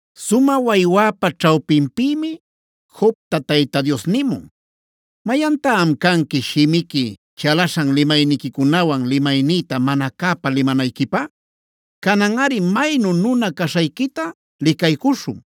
Sumä waywäpa ćhawpinpïmi Jobta Tayta Dios nimun: “¿Mayantá am canqui shimiqui chalaśhan limayniquicunawan limapaynïta mana cäpa licanayquipä? Cananꞌari maynu nuna-nuna caśhayquita licaycuśhun.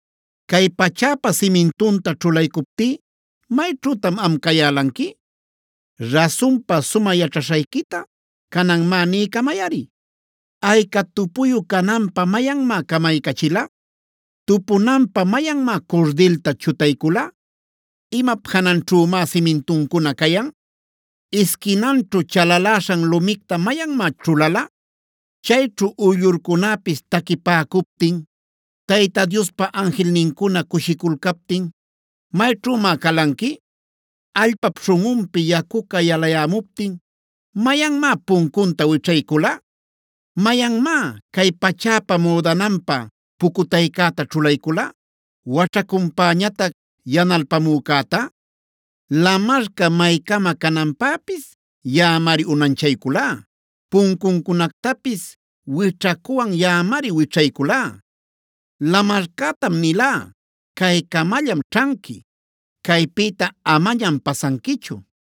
“¿Cay pachäpa simintunta ćhulaycuptí mayćhütan am cayälanqui? Rasunpa sumä yaćhaśhayquita canan má niycamayꞌari. ¿Ayca tupuyu cananpä mayanmá camaycachila? ¿Tupunanpä mayanmá curdilta chutaycula? ¿Imap jananćhümá simintuncuna cayan? ¿Isquinanćhu chalaläśhan lumicta mayanmá ćhulala? ¿Chayćhu uyllurcunäpis taquipäcuptin, Tayta Diospa anjilnincuna cushiculcaptin mayćhümá calanqui? “¿Allpap śhunꞌunpi yacuca yalayämuptin mayanmá puncunta wićhaycula? ¿Mayanmá cay pachäpa müdananpä pucutaycäta ćhulaycula, waćhacunpäñatac yanalpamücäta? Lamarca maycama cananpäpis yaꞌamari unanchayculá; puncuncunactapis wićhacuwan yaꞌamari wićhayculá. Lamarcätam nilá: ‘Caycamallam ćhanqui; caypïta amañam pasanquichu.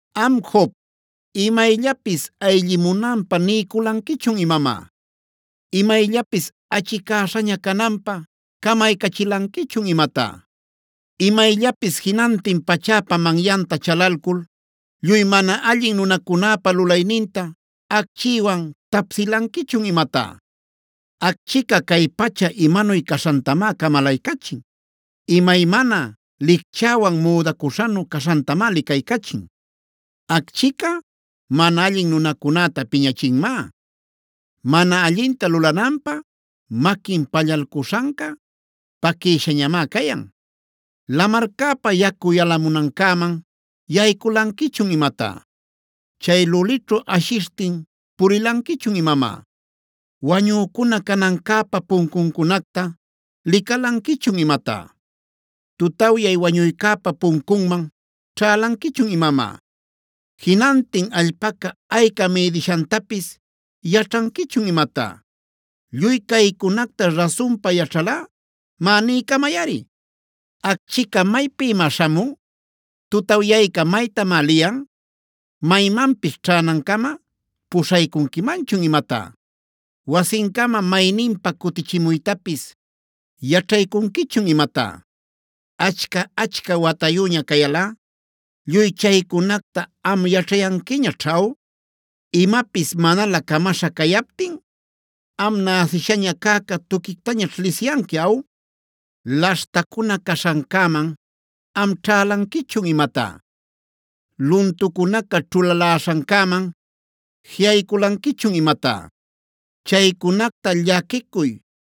“Am Job, ¿imayllapis ayllimunanpä niyculanquichun imamá? ¿Imayllapis achicäśhaña cananpä camaycachilanquichun imatá? ¿Imayllapis jinantin pachäpa manyanta chalalcul lluy mana allin nunacunäpa lulayninta acchïwan tapsïlanquichun imatá? Acchica cay pacha imanuy caśhantamá camalaycachin; imaymana licchäwan müdacuśhanu caśhantamá licaycachin. Acchica mana allin nunacunäta piñachinmá; mana allinta lulananpä maquin pallalcuśhanca paquïshañamá cayan. “¿Lamarcäpa yacu yalamunancäman yayculanquichun imatá? ¿Chay lulićhu ashishtin pulilanquichun imamá? ¿Wañücuna canancäpa puncuncunacta licalanquichun imatá? ¿Tutawyay wañuycäpa puncunman ćhälanquichun imamá? ¿Jinantin allpaca ayca mïdishantapis yaćhanquichun imatá? Lluy caycunacta rasunpa yaćhalꞌa, má niycamayꞌari. “¿Acchica maypïmá śhamun? ¿Tutawyayca maytamá liyan? ¿Maymanpis ćhänancama puśhaycunquimanchun imatá? ¿Wasincama mayninpa cutichimuytapis yaćhaycunquichun imatá? ¿Achca-achca watayüña cayalꞌa lluy chaycunacta am yaćhayanquiñaćh aw? ¿Imapis manalä camaśha cayaptin, am näsishaña cäca tuquictañaćh lisiyanqui aw? “¿Laśhtacuna caśhancäman am ćhälanquichun imatá? ¿Luntucunaca ćhulaläśhancäman jiꞌayculanquichun imatá? Chaycunacta llaquicuy,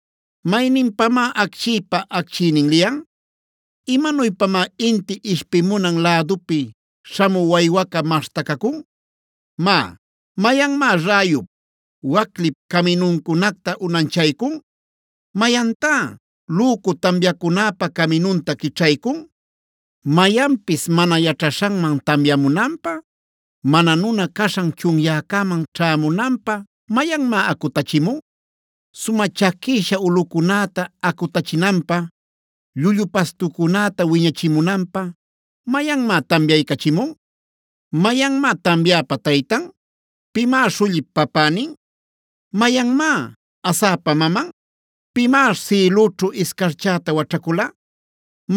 ¿Mayninpamá acchïpa acchiynin liyan? ¿Imanuypamá inti ishpimunan lädupi śhamü waywaca maśhtacacun? “Má, ¿mayanmá räyup, waclip caminuncunacta unanchaycun? ¿Mayantá lücu tamyacunäpa caminunta quićhaycun? ¿Mayanpis mana yaćhaśhanman tamyamunanpä, mana nuna caśhan chunyäcäman ćhämunanpä mayanmá acutachimun? ¿Sumä chaquïsha ulꞌucunäta acutachinanpä, llullu pastucunäta wiñachimunanpä mayanmá tamyaycachimun? “¿Mayanmá tamyäpa taytan? ¿Pimá śhullip papänin? ¿Mayanmá asäpa maman? ¿Pimá sïlüćhu iscarchäta waćhacula?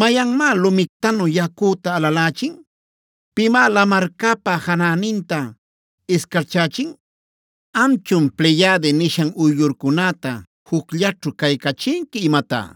¿Mayanmá lumictanu yacüta alalächin? ¿Pimá lamarcäpa janäninta iscarchächin? “¿Amchun ‘Pleyade’ nishan uyllurcunäta jucllaćhu caycachinqui imatá?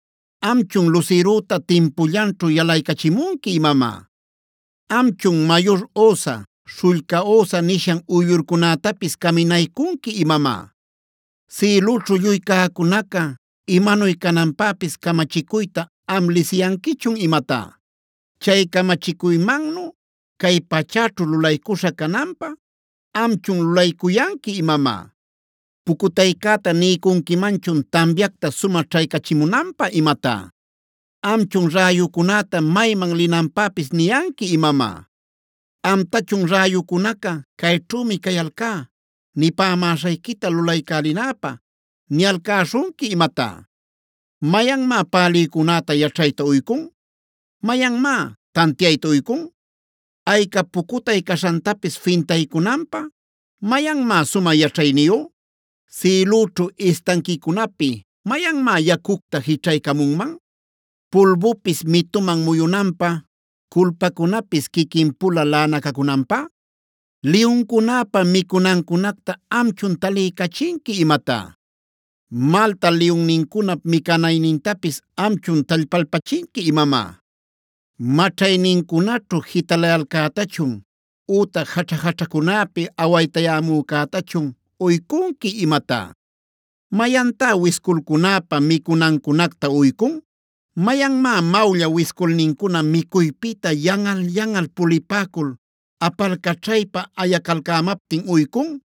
¿Amchun lusirüta timpullanćhu yalaycachimunqui imamá? ¿Amchun ‘Mayur Osa, Śhullca Osa’ nishan uyllurcunätapis caminaycunqui imamá? ¿Sïlüćhu lluy cäcunaca imanuy cananpäpis camachicuyta am lisiyanquichun imatá? ¿Chay camachicuymannu cay pachäćhu lulaycuśha cananpä amchun lulaycuyanqui imamá? “¿Pucutaycäta niycunquimanchun tamyacta sumä ćhaycachimunanpä imatá? ¿Amchun räyucunäta mayman linanpäpis niyanqui imamá? ¿Amtachun räyucunaca: ‘Cayćhümi cayalcá nipämäśhayquita lulaycälinäpä’ niyalcäśhunqui imatá? ¿Mayanmá pälïcunäta yaćhayta uycun? ¿Mayanmá tantiayta uycun? ¿Ayca pucutay caśhantapis fintaycunanpä mayanmá sumä yaćhayniyu? ¿Sïlüćhu istanquicunapi mayanmá yacucta jićhaycamunman, pulbupis mituman muyunanpä, culpacunapis quiquin-pula laꞌanacacunanpä? “¿Liyuncunäpa micunancunacta amchun taliycachinqui imatá? ¿Malta liyunnincunap micanaynintapis amchun tallpalpachinqui imamá? ¿Maćhaynincunaćhu jitalayalcätachun ütac jaćha-jaćhacunäpi awaytayämücätachun uycunqui imatá? ¿Mayantá wisculcunäpa micunancunacta uycun? ¿Mayanmá mawlla wisculnincuna micuypïta yanꞌal-yanꞌal pulipäcul apalcaćhaypa ayacalcämaptin uycun?